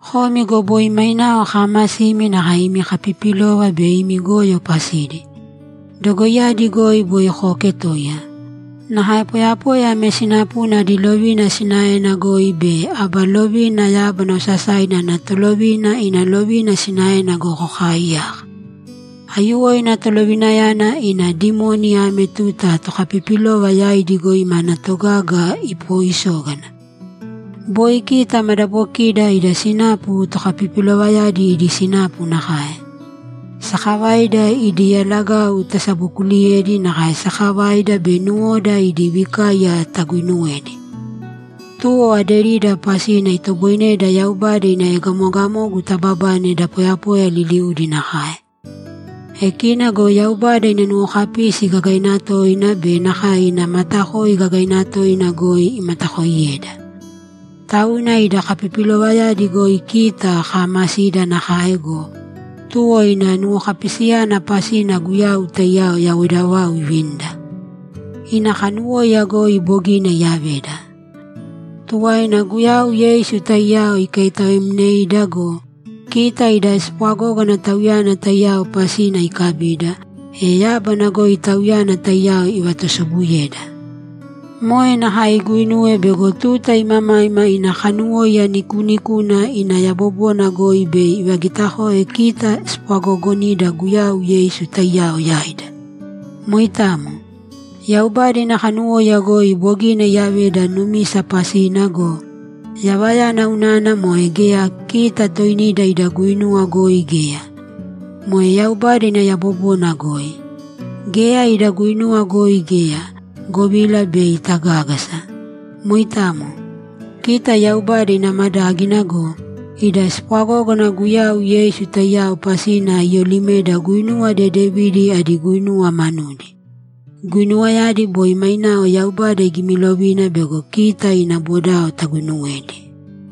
Komi go boi mainao kaamasimi nakae imi kapipilova be imi goyo pasidi. Dogoiyadi goi boi kooketoiya. Nakae poyapoya ame sinapuna adi lovina sinaena goi be aba lovina yábana osasaina ana tolovina ina lovina sinaena goi kokaaiyaka. Aiyuwoina tolovinayana ina dimoni ame tuta tokapipilova yaidi goi mana togaga ipooisógana. Boi kita madabokida ida sinapu tokapipilovayadi idi sinapu nakae. Sakavaida idi yalagau tasabokuuliyedi nakae sakavaida be nuwoda idi vikaiya taguuinuwedi. Tuwo aderida pasina itoboineda Yaubada ina egamogamogu tababane da poyapoya liliudi nakae. E kina go Yaubada ina nuwokapisi gagaina toina be nakae ina matakoi gagaina toina goi imatakooiyeda. Tauna ida kapipilovayadi goi kita kaamasida nakae go, tuwo ina nuwokapisiyana pasina Guyau taiyao yawoida vau ivinida. Ina kanuwóiya goi bogina iyaveda. Tuwaina Guyau Yeisu taiyao ikaitaoemneida go, kita ida spwagógana Tauyana taiyao pasina ikabida, e yábana goi Tauyana taiyao ivatusobuyeda. Moe nakae iguinuwe bego tuta imamaima ina kanuwóiya nikuunikuna ina yabobona goi bei ivagitakoe kita spwagoogonida Guyau Yeisu taiyao yaida. Moitamo. Yaubada ina kanuwóiya goi bogina iyaveda numisa pasina go, yavayana unana moe geya kita toinida ida guinuwa goi geya. Moe Yaubada ina yabobona goi. Geya ida guinuwa goi geya, govila bei tagágasa. Moitamo. Kita Yaubada ina madágina go, ida spwagógana Guyau Yeisu taiyao pasina iyolimeda guinuwa dedevidi adi guinuwa manudi. Guinuwayadi boi mainao Yaubada igimilovina bego kita ina bodao taguinuwedi.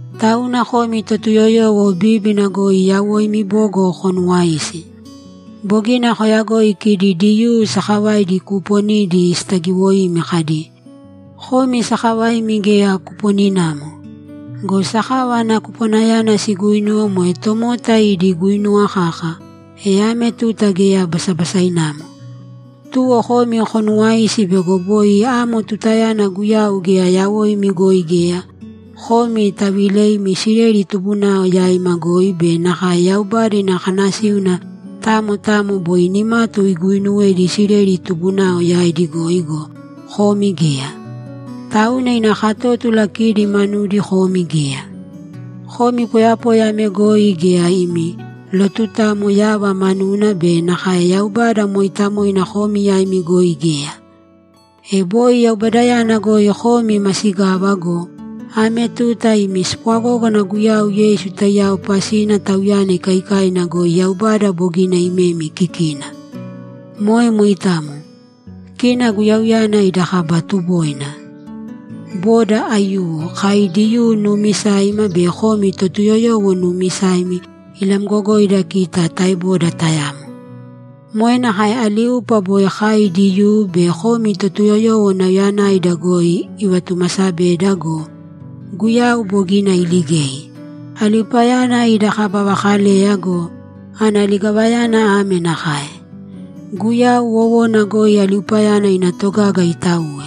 Tauna komi Totuyoyowo bíbina goi yawoimi bogo konuwāisi. Bogina koyagoi kidi Diyuu sakavaidi kuuponidi sitagiwoimi kadi, ‘Komi sakavaimi geya kuponinamo.’ Go sakava ana kupwanayana siguuinuwe moe tomota idi guinuwa kaka, e ame tuta geya basabasainamo. Tuwo komi konuwāisi bego boi amo tutayana Guyau geya yawoimi goi geya; komi taviileimi Isileli tubunao yaima goi be nakae Yaubada ina kanasíuna tamo tamo boi nimatu iguuinuwedi Isileli tubunao yaidi goi go, komi geya. Tauna ina katótula kidi manudi komi geya. Komi poyapoya ame goi geya imi lotutamo yava manuna be nakae Yaubada mooitamoina komi yaimi goi geya. E boi Yaubadayana goi komi masigava go, ame tuta imi spwagógana Guyau Yeisu taiyao pasina Tauyana ikaikaina goi Yaubada bogina imemi kikina. Moe moitamo. Kina Guyauyana ida kaba tuboina. Boda aiyuwo, kai Diyuu nuumisaima be komi Totuyoyowo nuumisaimi, ilamgogoida kita taeboda tayamo. Moe nakae aliupa boi kai Diyuu be komi Totuyoyowo nauyayanaida goi ivatumaasabeda go, Guyau bogina iligei. Aliupayana ida kaba vakaleya go, ana ligavayana ame nakae: Guyau wowona goi aliupayana ina togaga itauwe.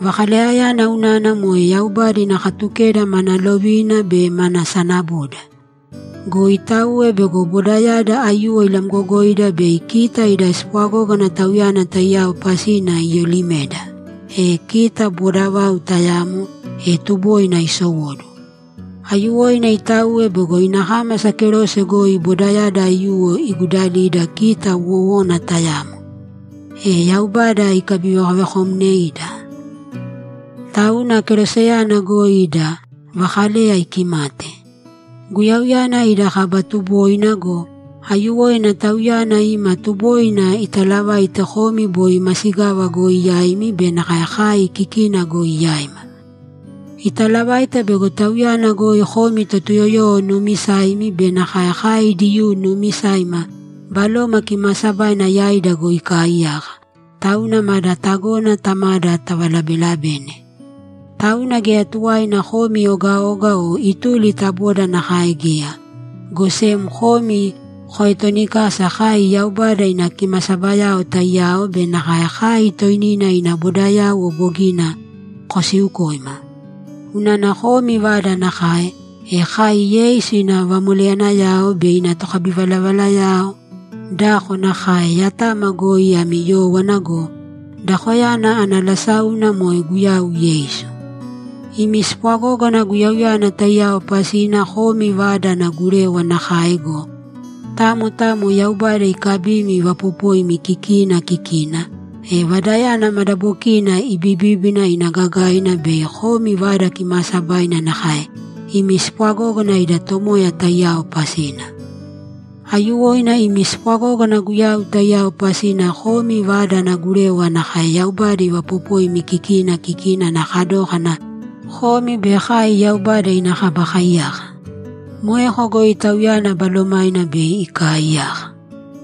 Vakaleyayana unana moe Yaubada ina Katukeda mana lovina be mana sanaboda. Go itauwe bego bodayada aiyuwo ilamgogoida bei kita ida spwagógana Tauyana taiyao pasina iyolimeda, e kita boda vau tayamo, e tuboina isowóduwo. Aiyuwoina itauwe bego ina kámasa kerose goi bodayada aiyuwo igudalida kita wówana tayamo, e Yaubada ikabivekovekomneida. Tauna keroseyana goi ida vakaleya ikimate. Guyauyana ida kaba tuboina go, aiyuwoina Tauyana ima tuboina italavaite komi boi masigava goi yaimi be nakae kai kikina goi yaima. Italavaite bego Tauyana goi komi Totuyoyowo nuumisaimi be nakae kai Diyuu nuumisaima Baloma Kimaasabaina yaida goi ikaaiyaka, tauna mada tagona Tamada tavalabelabene. Tauna geya tuwaina komi ogaoga o ituli ta boda nakae geya, go sem komi koetonikasa kai Yaubada ina kimasabayao taiyao be nakae kai toinina ina bodayauwo bogina kosiukoima. Unana komi vada nakae, e kai Yeisu ina vamoleyanayao be ina tokabivalavalayao dako nakae yatama goi ami yówana go, dakoyana ana lasáuna moe Guyau Yeisu. Imi spwagógana Guyauyana taiyao pasina komi vada ana gurewa nakae go, tamo tamo Yaubada ikabimi ivaapopoimi kikina kikina, e vadayana madabokina ibibíbina ina gagaina bei komi Vada Kimaasabaina nakae imi spwagógana ida Tomoya taiyao pasina. Aiyuwoina imi spwagógana Guyau taiyao pasina komi vada ana gurewa nakae Yaubada ivaapopoimi kikina kikina ana kadókana komi be kai Yaubada ina kaba kaiyaka. Moeko goi Tauyana Balomaina bei ikaaiyaka.